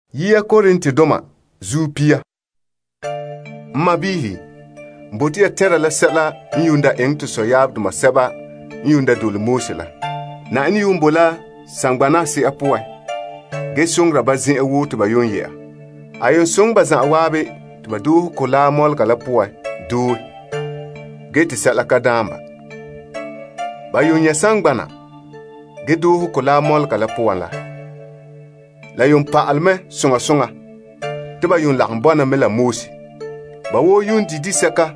Tɔ. N sɔɔnrɔ, n bote ya tɛnra la sɛla n daa eŋɛ to sɔyaabdoma sɛba n dole Moses la. Na'ayenɛ bo la saŋgbana a se'a poan gee soŋora ba zen'an woo te ba yɛ'a. A soŋɛ ba zanwaabe te ba doohe Mɔgɔ Mɔlega la poan doe gee te sɛla ka daan ba. Ba nyɛ' saŋgbana gee doohe Mɔgɔ Mɔlega la poan la, la pa'alɛ mɛ soŋa soŋa te ba yuun lagom bɔna mɛ la Moses. Ba woo di' disɛka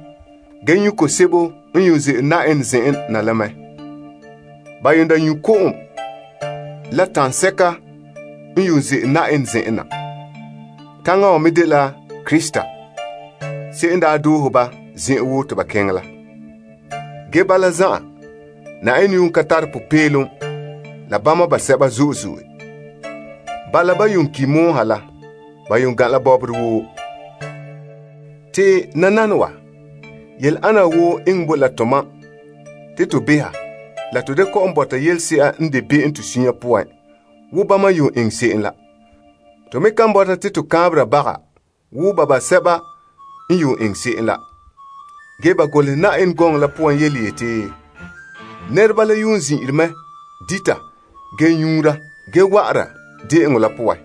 ge nyu' ko'om sebo n ze'ele Na'ayenɛ zen'en na la mɛ. Ba nyu' ko'om la taŋsɛka n ze'ele Na'ayenɛ zen'en na. Taŋa wa me dela Krista se'em n daa doohe ba zen'an woo te ba keŋɛ la. Ge bala zan'an, Na'ayenɛ ka tare popeelom la bama basɛba zo'e zo'e. Bala ban ki' pɔgɔtia poan la. Ba gan' la bɔbɔre woo. Te nananawa, yele ana wa woo enŋɛ bo la to mam te to beha la to da kɔ'ɔn bɔta yelese'a n de be'em to sunya poan wo bama n eŋɛ se'em la. To me kan bɔta te to kaanbera baga wo ba basɛba n eŋɛ se'em la. Ge ba golehɛ Yenɛ gɔŋɔ la poan yeti, Nɛreba la zin'ire mɛ dita gee bugura gee wa'ara de'eŋɔ la poan.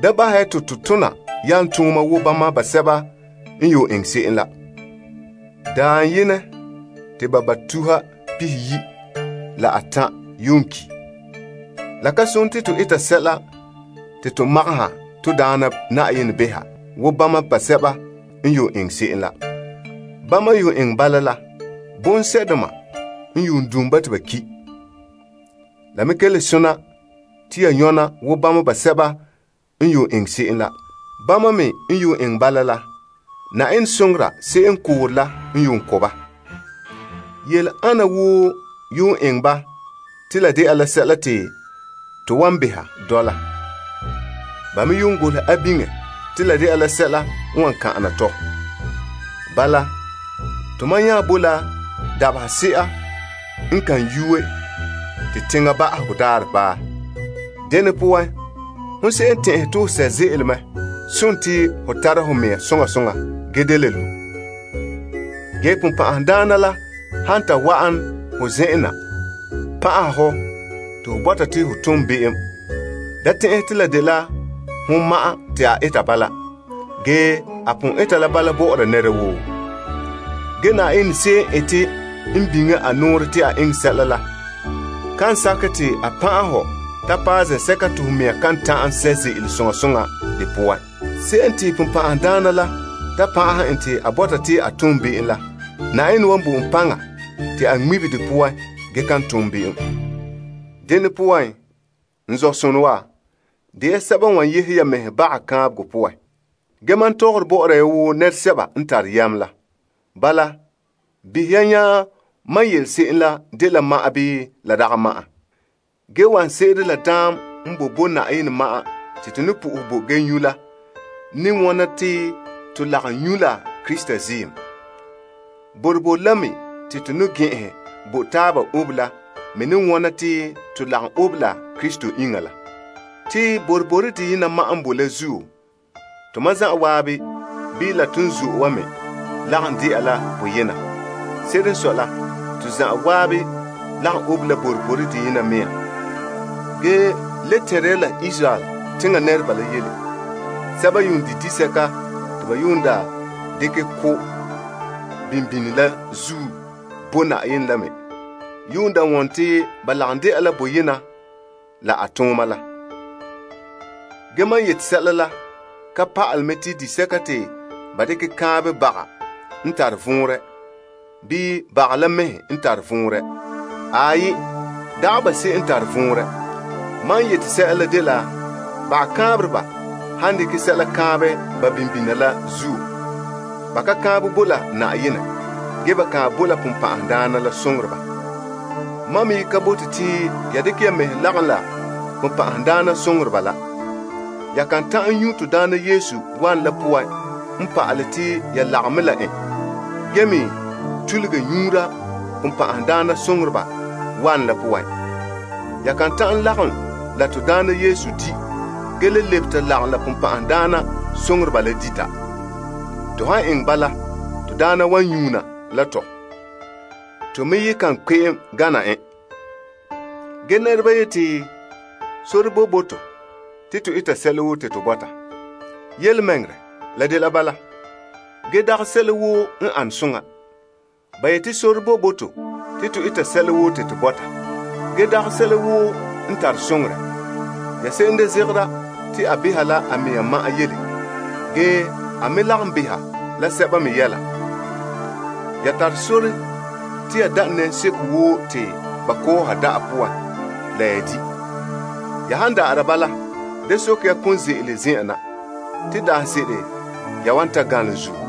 Da bahɛ ya te to tona yalomtooma wo bama basɛba n eŋɛ se'em la. Dabaherɛ yenɛ te ba tuha pihiyi' la atan' ki'. La ka sone te to eta sɛla te to magahɛ to Daana Na'ayenɛ behɛ wo bama basɛba n eŋɛ se'em la. Bama n eŋɛ bala la, bonsɛ'doma n don' ba te ba ki'. La me ka le sona te ya nyɔna wo bama basɛba n eŋɛ se'em la. Bama me n eŋɛ bala la, Na'ayenɛ soŋora se'em n koore la n ko' ba. Yele ana woo eŋɛ ba te la de'a la sɛla te to wan beha dɔla. Ba me golehɛ a biŋe te la de'a la sɛla n wan kan'ana tɔ. Bala, to mam nya bo la dabahese'a n kan yue gee te teŋa ba'ahegɔ daarɛ paɛ. Dene poan, hon se'em n tɛn'ɛhe te ho sɛ' ze'ele sontii ho tara ho mea soŋa soŋa gee da le lu'. Ge ponpan'ahadaana la han ta wa'an ho zen'en na pan'aha ho te ho bɔta te ho tom be'em, da tɛn'ɛhɛ te la dela hon ma'an te a eta bala. Ge, a pon eta la bala bɔ'ɔra nɛra woo. Ge, Na'ayenɛ se'em n ete n biŋe a nɔɔrɛ te a eŋɛ se'em la kan sakɛ te a pan'ahɛ hɔ ta paɛ zen'sɛka te ho mea kan ta'an sɛ' ze'ele soŋa soŋa de poan. Se'em te ponpan'ahadaana la ta pan'aha en te a bɔta te a tom be'em la, Na'ayenɛ wan bo en paŋa te a ŋmibe de poan gee kan tom be'em. Dene poan, n zɔ'sonɔ wa, de ya sɛba n wan yehe ya mɛhe baga kaanbegɔ poan. Ge mam tɔgɔre bɔ'ɔra ya wo nɛresɛba n tare yam la. Bala, behɛ ya nya mam yele se'em la dela ma'an bii la dagɛ ma'an. Ge wanɛ se'ere la daam n boe bo Na'ayenɛ ma'an te to ne po'ohɛ bo gee nyu' la ne wona te to lagom nyu' la Krista ziim. Boroboro la me te to ne gɛn'ɛnhɛ bo taaba obe la me ne wɔna te to lagom obe la Krista iŋa la. Te boroboro deyena ma'an n bo la zuo, tomam zanwaabe bii la ton zo'e wa me lagom de'a la boyena. Se'ere n sɔe la, to zanwaabe lagom obe la boroboro deyena mea nɔɔ. Ge le tɛnre ya la Israel teŋa nɛreba la yele. Sɛba n di' disɛka te ba dekɛ ko' kaanbegɔ daka la zuo bo Na'ayenɛ la me wone te ba lagom de'a la boyena la a tooma la. Ge mam yete sɛla la ka pa'alɛ mɛ te disɛka te ba dekɛ kaanbɛ baga n tare vɔnrɛ, bii baga la mɛhe n tare vɔnrɛ. Aai, dagɛ ba se'em n tare vɔnrɛ. Mam n yete sɛla la dela bagakaanbereba han dekɛ sɛla kaanbɛ ba bimbina la zuo, ba ka kaanbɛ bo la Na'ayenɛ, ge ba kaanbɛ bo la bonbɛ'ɛhe. Mam me ye ka bote te ya dekɛ ya mɛhe lagom la bonbɛ'ɛhe la. Ya kan ta'an nyu' to Daana Yesu wanɛ la poan n pa'alɛ te ya lagom mɛ la en, gee me tuluge nyuura bonbɛ'ɛhe wanɛ la poan. Ya kan ta'an lagom la to Daana Yesu di' gee le lebe ta lagom la bonbɛ'ɛhe la dita. To han eŋɛ bala, to Daana wan nyuuna la tɔ. To me ye ka kpe'em gana en. Ge nɛreba yete te, Sore boe bo to te to eta sɛla woo te to bɔta. Yelemɛŋɛrɛ, la dela bala, ge dagɛ sɛla woo n an soŋa. Ba yeti, Sore boe bo to te to eta sɛla woo te to bɔta. Ge, dagɛ sɛla woo n tare soŋorɛ. Ya se'em da zegera te a beha la a mea ma'an yele, ge a me lagom beha la sɛba me yɛla. Ya tare sore te ya da' nɛnseko woo te ba kɔɔha da'a poan la la ya di'. Ya han da'ara bala da soke ya konze'ele zen'en na te daanse'ere ya wan ta ganlom zuo.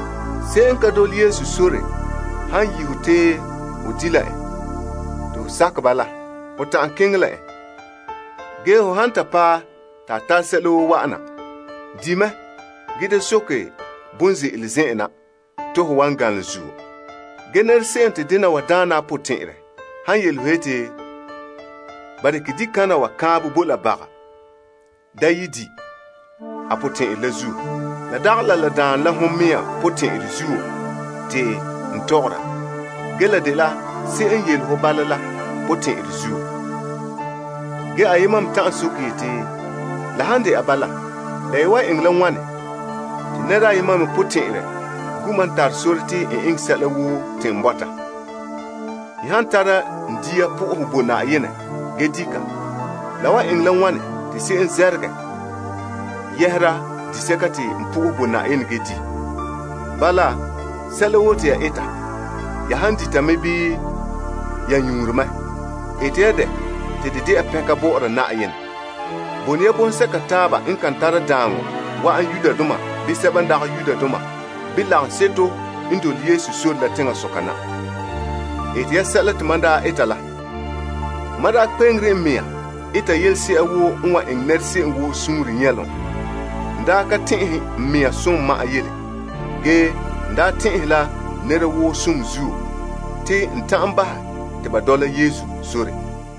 Se'em n ka dole Yesu sore han yi' ho te ho di' la en te ho sakɛ bala, ho ta'an keŋɛ la en. Ge, ho han paɛ te a tare sɛla woo wa'ana, di' mɛ gee da soke bon ze'ele zen'an na to ho wan ganlom zuo. Ge, nɛra se'em te dena wa daana a potɛn'ɛrɛ han yele ho yeti, Ba dekɛ dikana wa kaanbɛ bo la baga. Da ye di' a potɛn'ɛrɛ la zuo. La dagɛ la la daane la hon mea potɛn'ɛrɛ zuo te n tɔgɔra, ge la dela se'em n yele ho bala la potɛn'ɛrɛ zuo. Ge ayema me ta'an soke yeti, La han de'a bala, la ye wan eŋɛ la wane te nɛra ayema me potɛn'ɛrɛ gu' mam tare sore te n eŋɛ sɛla woo te n bɔta? N han tara n dia po'ohɛ bo Na'ayenɛ gee di' ka, la wan eŋɛ la wane te se'em zɛrɛgɛ yɛhera disɛka te a po'ohɛ bo Na'ayenɛ gee di'? Bala, sɛla woo te ya eta, ya han dita mɛ bii ya nyuunre mɛ, eta ya dɛ te de de'a pɛnka bɔ'ɔra Na'ayenɛ. Bone ya bɔŋsɛka taaba n kan tare daaŋɔ wa'an Yudoma bii Greekdoma bii lagaŋseto n dole Yesu sore la teŋasoka na. Ete ya sɛla te mam daa eta la. Mam daa kpe'enre n mea eta yelese'ere woo n wan eŋɛ nɛra se'em woo suunre nyɛlom n daa ka tɛn'ɛhe n mea som ma'an yele. Ge, n daa tɛn'ɛhe la nɛra woo som zuo te n ta'an bahɛ ba te ba dɔla Yesu sore.